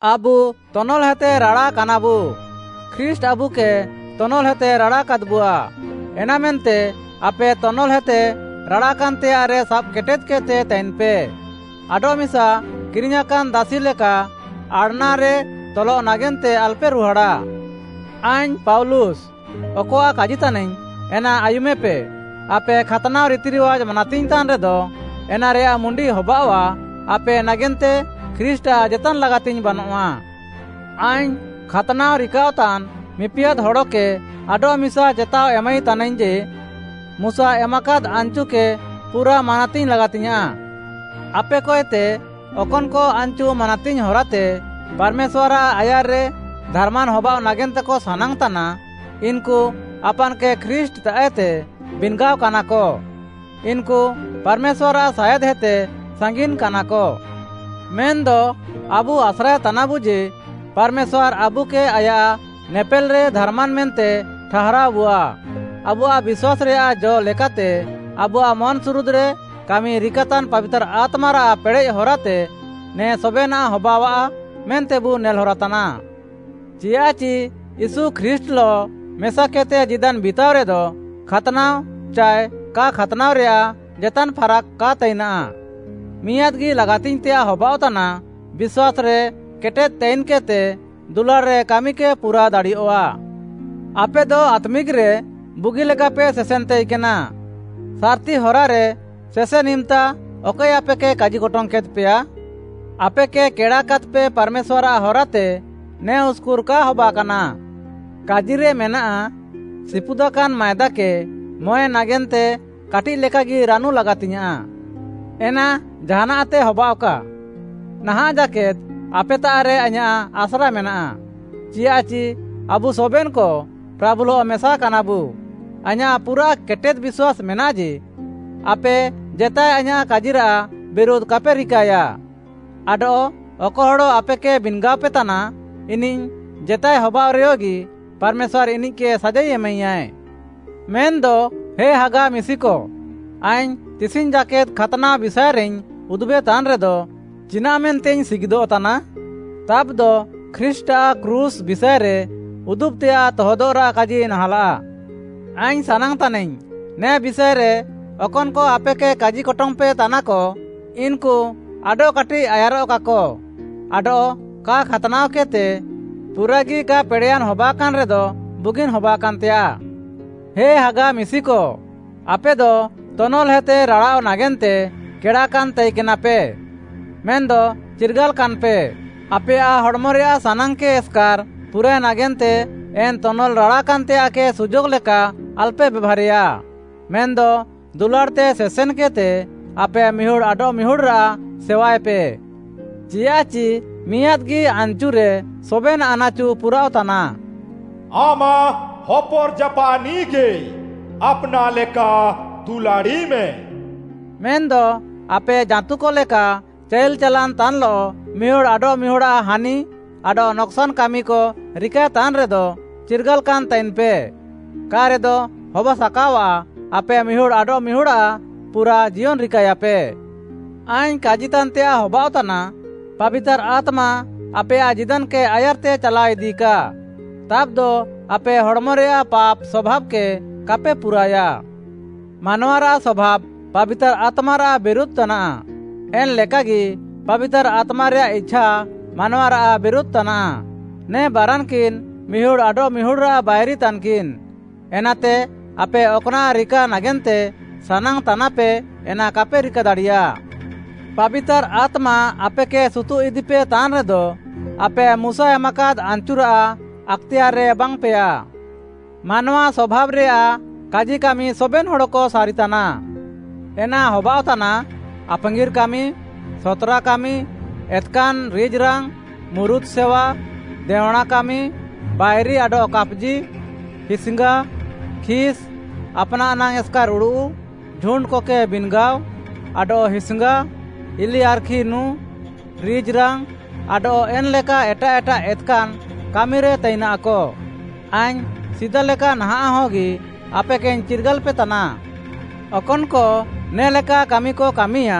ଆବୁ ତନଲ୍‌ହେତେ ରାଡ଼ାକାନାବୁ। ଖ୍ରୀଷ୍ଟ୍‌ ଆବୁକେ ତନଲ୍‌ହେତେ ରାଡ଼ାକାଦ୍‌ବୁଆ। ଏନାମେନ୍ତେ ଆପେ ତନଲ୍‌ହେତେ ରାଡ଼ାକାନ୍‌ତେୟାଃରେ ସାବ୍‌କେଟେଦ୍‌କେଦ୍‌ତେ ତାଇନ୍‌ପେ। ଆଡଃମିସା କିରିଙ୍ଗ୍‌ୟାଁକାନ୍‌ ଦାସି ଲେକା ଆଡ଼୍‌ନାରେ ତଲଃ ନାଗେନ୍ତେ ଆଲପେ ରୁହାଡ଼ା। ଆଇଙ୍ଗ୍‌ ପାଉଲୁସ୍‌, ଅକଆଃ କାଜିତାନାଇଙ୍ଗ୍‌ ଏନା ଆୟୁମେପେ, ଆପେ ଖାତ୍‌ନାଅ ରିତିରିୱାଜ୍‌ ମାନାତିଙ୍ଗ୍‌ତାନ୍‌ ରେଦ, ଏନାରେୟାଃ ମୁଣ୍ଡି ହବାଅଃଆ, ଆପେ ନାଗେନ୍ତେ ଖ୍ରୀଷ୍ଟ୍‌ଆଃ ଜେତାନ୍‌ ଲାଗାତିଙ୍ଗ୍‌ ବାନଃଆ। ଆଇଙ୍ଗ୍‌ ଖାତ୍‌ନାଅ ରିକାଅଃତାନ୍‌ ମିପିଆଦ୍‌ ହଡ଼କେ ଆଡଃମିସା ଚେତାଅ ଏମାଇ ତାନାଇଙ୍ଗ୍‌ ଯେ, ମୁଶା ଏମାକାଦ୍ ଆନ୍‌ଚୁକେ ପୁରା ମାନାତିଙ୍ଗ୍‌ ଲାଗାତିଙ୍ଗ୍‌ୟାଁଃ। ଆପେକଏତେ ଅକନ୍‌କ ଆନ୍‌ଚୁ ମାନାତିଙ୍ଗ୍‌ ହରାତେ ପାର୍‌ମେଶ୍ୱାର୍‌ଆଃ ଆୟାର୍‌ରେ ଧାର୍‌ମାନ୍‌ ହବାଅଃ ନାଗେନ୍ତେକ ସାନାଙ୍ଗ୍‌ତାନା, ଇନ୍‌କୁ ଆପାନ୍‌କେ ଖ୍ରୀଷ୍ଟ୍‌ତାଃଏତେ ବିନ୍‌ଗାଅକାନାକ, ଇନ୍‌କୁ ପାର୍‌ମେଶ୍ୱାର୍‌ଆଃ ସାୟାଦ୍‌ହେତେ ସାଙ୍ଗିନ୍‌କାନାକ। ମେନ୍‌ଦ ଆବୁ ଆସ୍ରାଏତାନାବୁ ଯେ, ପାର୍‌ମେଶ୍ୱାର୍‌ ଆବୁକେ ଆୟାଃ ନେପେଲ୍‌ରେ ଧାର୍‌ମାନ୍‌ ମେନ୍ତେ ଠାହାରାଅବୁଆ, ଆବୁଆଃ ବିଶ୍ୱାସ୍‌ରେୟାଃ ଜ ଲେକାତେ ଆବୁଆଃ ମନ୍‌ସୁରୁଦ୍‌ରେ କାମି ରିକାତାନ୍‌ ପାବିତାର୍‌ ଆତ୍ମାରାଃ ପେଡ଼େଃ ହରାତେ, ନେ ସବେନାଃ ହବାଅଃଆ ମେନ୍ତେବୁ ନେଲ୍‌ ହରାତାନା। ଚିୟାଃଚି ୟୀଶୁ ଖ୍ରୀଷ୍ଟ୍‌ଲଃ ମେସାକେଦ୍‌ତେ ଜୀଦାନ୍ ବିତାଅରେଦ, ଖାତ୍‌ନାଅ ଚାଏ କା ଖାତ୍‌ନାଅରେୟାଃ ଜେତାନ୍‌ ଫାରାକ୍‌ କା ତାଇନାଃ। ମିଆଁଦ୍‌ଗି ଲାଗାତିଙ୍ଗ୍‌ତେୟାଃ ହବାଅଃତାନା, ବିଶ୍ୱାସ୍‌ରେ କେଟେଦ୍‌ ତାଇନ୍‌କେଦ୍‌ତେ ଦୁଲାଡ଼୍‌ରେ କାମିକେ ପୁରା ଦାଡ଼ିୟଃଆ। ଆପେଦ ଆତ୍ମିକ୍‌ରେ ବୁଗିଲେକାପେ ସେସେନ୍‌ ତାଇକେନା, ସାର୍‌ତି ହରାରେ ସେସେନ୍‌ ଇମ୍‌ତା ଅକଏ ଆପେକେ କାଜିକଟଙ୍ଗ୍‌ କେଦ୍‌ପେୟା? ଆପେକେ କେଡ଼ାକାଦ୍‌ପେ ପାର୍‌ମେଶ୍ୱାର୍‌ଆଃ ହରାତେ ନେ ଉସ୍‌କୁର୍‌ କା ହବାକାନା। କାଜିରେ ମେନାଃ, “ସିପୁଦାକାନ୍‌ ମାଏଦାକେ ମଁଏ ନାଗେନ୍ତେ କାଟିଃ ଲେକାଗି ରାନୁ ଲାଗାତିଙ୍ଗ୍‌ୟାଁଃ।” ଏନା ଜାହାନାଃତେ ହବାଅଃକା, ନାହାଁଃ ଜାକେଦ୍ ଆପେତାଃରେ ଆଇଁୟାଃ ଆସ୍ରା ମେନାଃ, ଚିଆଃଚି ଆବୁ ସବେନ୍‌କ ପ୍ରାଭୁଲଃ ମେସାକାନାବୁ, ଆଇଁୟାଃ ପୁରାଃ କେଟେଦ୍‌ ବିଶ୍ୱାସ୍‌ ମେନାଃ ଯେ, ଆପେ ଜେତାଏ ଆଇଁୟାଃ କାଜିରାଃ ବିରୁଧ୍‌ କାପେ ରିକାଏୟା। ଆଡଃ ଅକ ହଡ଼ ଆପେକେ ବିନ୍‌ଗାଅପେ ତାନା, ଇନିଃ ଜେତାଏ ହବାଅଃରେୟଗି ପାର୍‌ମେଶ୍ୱାର୍‌ ଇନିଃକେ ସାଜାଇ ଏମାଇୟାଏ। ମେନ୍‌ଦ ହେ ହାଗା ମିଶିକ, ଆଇଙ୍ଗ୍‌ ତିସିଙ୍ଗ୍‌ ଜାକେଦ୍‌ ଖାତ୍‌ନାଅ ବିଷାଏରେଇଙ୍ଗ୍‌ ଉଦୁବେତାନ୍‌ରେଦ, ଚିନାଃ ମେନ୍ତେଇଙ୍ଗ୍‌ ସିଗିଦଃତାନା? ତାବ୍‌ଦ ଖ୍ରୀଷ୍ଟ୍‌ଆଃ କ୍ରୁଶ୍‌ ବିଷାଏରେ ଉଦୁବ୍‌ତେୟାଃ ତହଦଃରାଃ କାଜି ନାହାଁଲାଃ। ଆଇଙ୍ଗ୍‌ ସାନାଙ୍ଗ୍‌ ତାନାଇଙ୍ଗ୍‌, ନେ ବିଷାଏରେ ଅକନ୍‌କ ଆପେକେ କାଜିକଟଙ୍ଗ୍‌ପେ ତାନାକ, ଇନ୍‌କୁ ଆଡଃକାଟିଃ ଆୟାର୍‌ରଃକାକ ଆଡଃ କା ଖାତ୍‌ନାଅକେଦ୍‌ତେ ପୁରାଗି କା ପେଡ଼େୟାନ୍‌ ହବାକାନ୍‌ ରେଦ ବୁଗିନ୍‌ ହବାକାନ୍‌ତେୟାଃ। ହେ ହାଗା ମିଶିକ, ଆପେଦ ତନଲ୍‌ହେତେ ରାଡ଼ାଅଃ ନାଗେନ୍ତେ କେଡ଼ାକାନ୍‌ ତାଇକେନାପେ। ମେନ୍‌ଦ ଚିର୍ଗାଲାକାନ୍‌ପେ, ଆପେୟାଃ ହଡ଼ମରେୟାଃ ସାନାଙ୍ଗ୍‌କେ ଏସ୍‌କାର୍‌ ପୁରାଏ ନାଗେନ୍ତେ ଏନ୍‌ ତନଲ୍‌ ରାଡ଼ାକାନ୍‌ତେୟାଃକେ ସୁଯୋଗ୍‌ ଲେକା ଆଲପେ ବେଭାର୍‌ରେୟା। ମେନ୍‌ଦ ଦୁଲାଡ଼୍‌ତେ ସେସେନ୍‌କେଦ୍‌ତେ ଆପେ ମିହୁଡ଼୍‌ ଆଡଃମିହୁଡ଼୍‌ରାଃ ସେୱାଏପେ। ଚିୟାଃଚି ମିଆଁଦ୍‌ଗି ଆନ୍‌ଚୁରେ ସବେନ୍‌ ଆନାଚୁ ପୁରାଅଃତାନା, “ଆମାଃ ହୋପର୍‌ଜାପାଃନିଃକେ ଆପ୍‌ନାଃ ଲେକା ଦୁଲାଡ଼ିମେ।” ମେନ୍‌ଦ ଆପେ ଜାଁତୁକ ଲେକା ଚାଇଲ୍‌ ଚାଲାନ୍‌ ତାନ୍‌ଲଃ ମିହୁଡ଼୍‌ ଆଡଃମିହୁଡ଼୍‌ଆଃ ହାନି ଆଡଃ ନକ୍‌ସାନ୍‌ କାମିକ ରିକାଏତାନ୍‌ରେଦ, ଚିର୍ଗାଲାକାନ୍ ତାଇନ୍‌ପେ, କା'ରେଦ ହବାସାକାଅଆଃ ଆପେ ମିହୁଡ଼୍‌ ଆଡଃମିହୁଡ଼୍‌ଆଃ ପୁରା ଜିୟନ୍‌ ରିକାଏଆପେ। ଆଇଙ୍ଗ୍‌ କାଜିତାନ୍‌ତେୟାଃ ହବାଅଃତାନା, ପାବିତାର୍‌ ଆତ୍ମା ଆପେୟାଃ ଜୀଦାନ୍‌କେ ଆୟାର୍‌ତେ ଚାଲାଅଇଦିକା। ତାବ୍‌ଦ ଆପେ ହଡ଼୍‌ମରେୟାଃ ପାପ୍‌ ସଭାବ୍‌କେ କାପେ ପୁରାଏୟା। ମାନୱାରାଃ ସଭାବ୍‌ ପାବିତାର୍‌ ଆତ୍ମାରାଃ ବିରୁଧ୍‌ ତାନାଃ, ଏନ୍‌ ଲେକାଗି ପାବିତାର୍‌ ଆତ୍ମାରେୟାଃ ଇଛା ମାନୱାରାଃ ବିରୁଧ୍‌ ତାନାଃ। ନେ ବାରାନ୍‌କିନ୍‌ ମିହୁଡ଼୍‌ ଆଡଃମିହୁଡ଼୍‌ରାଃ ବାଇରି ତାନ୍‌କିନ୍‌। ଏନାତେ ଆପେ ଅକ୍‌ନାଃ ରିକା ନାଗେନ୍ତେ ସାନାଙ୍ଗ୍‌ତାନାପେ, ଏନା କାପେ ରିକା ଦାଡ଼ିୟା। ପାବିତାର୍‌ ଆତ୍ମା ଆପେକେ ସୁତୁଃ ଇଦିପେ ତାନ୍‌ରେଦ, ଆପେ ମୁଶା ଏମାକାଦ୍‌ ଆନ୍‌ଚୁରାଃ ଆକ୍‌ତେୟାର୍‌ରେ ବାଙ୍ଗ୍‌ପେୟା। ମାନୱା ସଭାବ୍‌ରେୟାଃ କାଜିକାମି ସବେନ୍‌ ହଡ଼କ ସାରିତାନା। ଏନା ହବାଅଃତାନା, ଆପାଙ୍ଗିର୍‌ କାମି, ସତ୍‌ରା କାମି, ଏତ୍‌କାନ୍‌ ରିଜ୍‌ରାଙ୍ଗ୍‌, ମୁରୁତ୍‌ ସେୱା, ଦେଅଁଣା କାମି, ବାଇରି ଆଡଃ କାପ୍‌ଜି, ହିସ୍‌ଙ୍ଗା, ଖିସ୍‌, ଆପ୍‌ନାଃ ନାଙ୍ଗ୍‌ ଏସ୍‌କାର୍‌ ଉଡ଼ୁଃ, ଝୁଣ୍ଡ୍‌କକେ ବିନ୍‌ଗାଅ, ଆଡଃ ହିସ୍‌ଙ୍ଗା, ଇଲିଆର୍‌ଖି ନୁଁ, ରିଜ୍‌ରାଙ୍ଗ୍‌, ଆଡଃ ଏନ୍‌ଲେକା ଏଟାଃ ଏଟାଃ ଏତ୍‌କାନ୍‌ କାମିରେ ତାଇନାଃକ। ଆଇଙ୍ଗ୍‌ ସିଦା ଲେକା ନାହାଁଃ ହଗି ଆପେକେଇଙ୍ଗ୍‌ ଚିର୍ଗାଲ୍‌ପେ ତାନା। ଅକନ୍‌କ ନେ'ଲେକା କାମିକ କାମିୟା,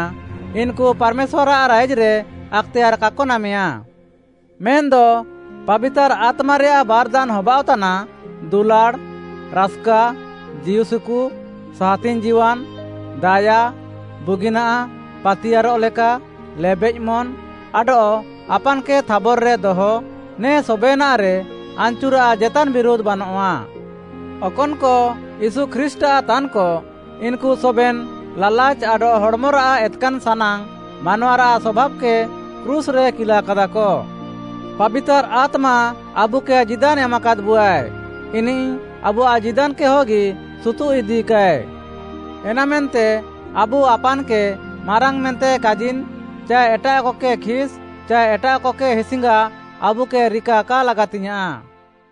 ଇନ୍‌କୁ ପାର୍‌ମେଶ୍ୱାର୍‌ଆଃ ରାଇଜ୍‌ରେ ଆକ୍‌ତେୟାର୍‌ କାକ ନାମେୟା। ମେନ୍‌ଦ ପାବିତାର୍‌ ଆତ୍ମାରେୟାଃ ବାର୍‌ଦାନ୍‌ ହବାଅଃତାନା, ଦୁଲାଡ଼୍‌, ରାସ୍‌କା, ଜୀଉସୁକୁ, ସାହାତିଙ୍ଗ୍‌ ଜୀୱାନ୍‌, ଦାୟା, ବୁଗିନାଃ, ପାତିୟାର୍‌ରଃ ଲେକା, ଲେବେଃ ମନ୍‌, ଆଡଃ ଆପାନ୍‌କେ ଥାବର୍‌ରେ ଦହ, ନେ ସବେନାଃରେ ଆନ୍‌ଚୁରାଃ ଜେତାନ୍‌ ବିରୁଧ୍‌ ବାନଆଃ। ଅକନ୍‌କ ୟୀଶୁ ଖ୍ରୀଷ୍ଟ୍‌ଆଃ ତାନ୍‌କ, ଇନ୍‌କୁ ସବେନ୍‌ ଲାଲାଚ୍‌ ଆଡଃ ହଡ଼୍‌ମରାଃ ଏତ୍‌କାନ୍ ସାନାଙ୍ଗ୍‌ ମାନୱାରାଃ ସଭାବ୍‌କେ କ୍ରୁଶ୍‌ରେ କିଲାକାଦାକ। ପାବିତାର୍‌ ଆତ୍ମା ଆବୁକେ ଜୀଦାନ୍ ଏମାକାଦ୍‌ବୁଆଏ, ଇନିଃ ଆବୁଆଃ ଜୀଦାନ୍‌କେ ହଗି ସୁତୁଃଇଦିକାଏ। ଏନାମେନ୍ତେ ଆବୁ ଆପାନ୍‌କେ ମାରାଙ୍ଗ୍‌ ମେନ୍ତେ କାଜିନ୍‌ ଚାଏ ଏଟାଃକକେ ଖିସ୍‌ ଚାଏ ଏଟାଃକକେ ହିସ୍‌ଙ୍ଗା ଆବୁକେ ରିକା କା ଲାଗାତିଙ୍ଗ୍‌ୟାଁଃ।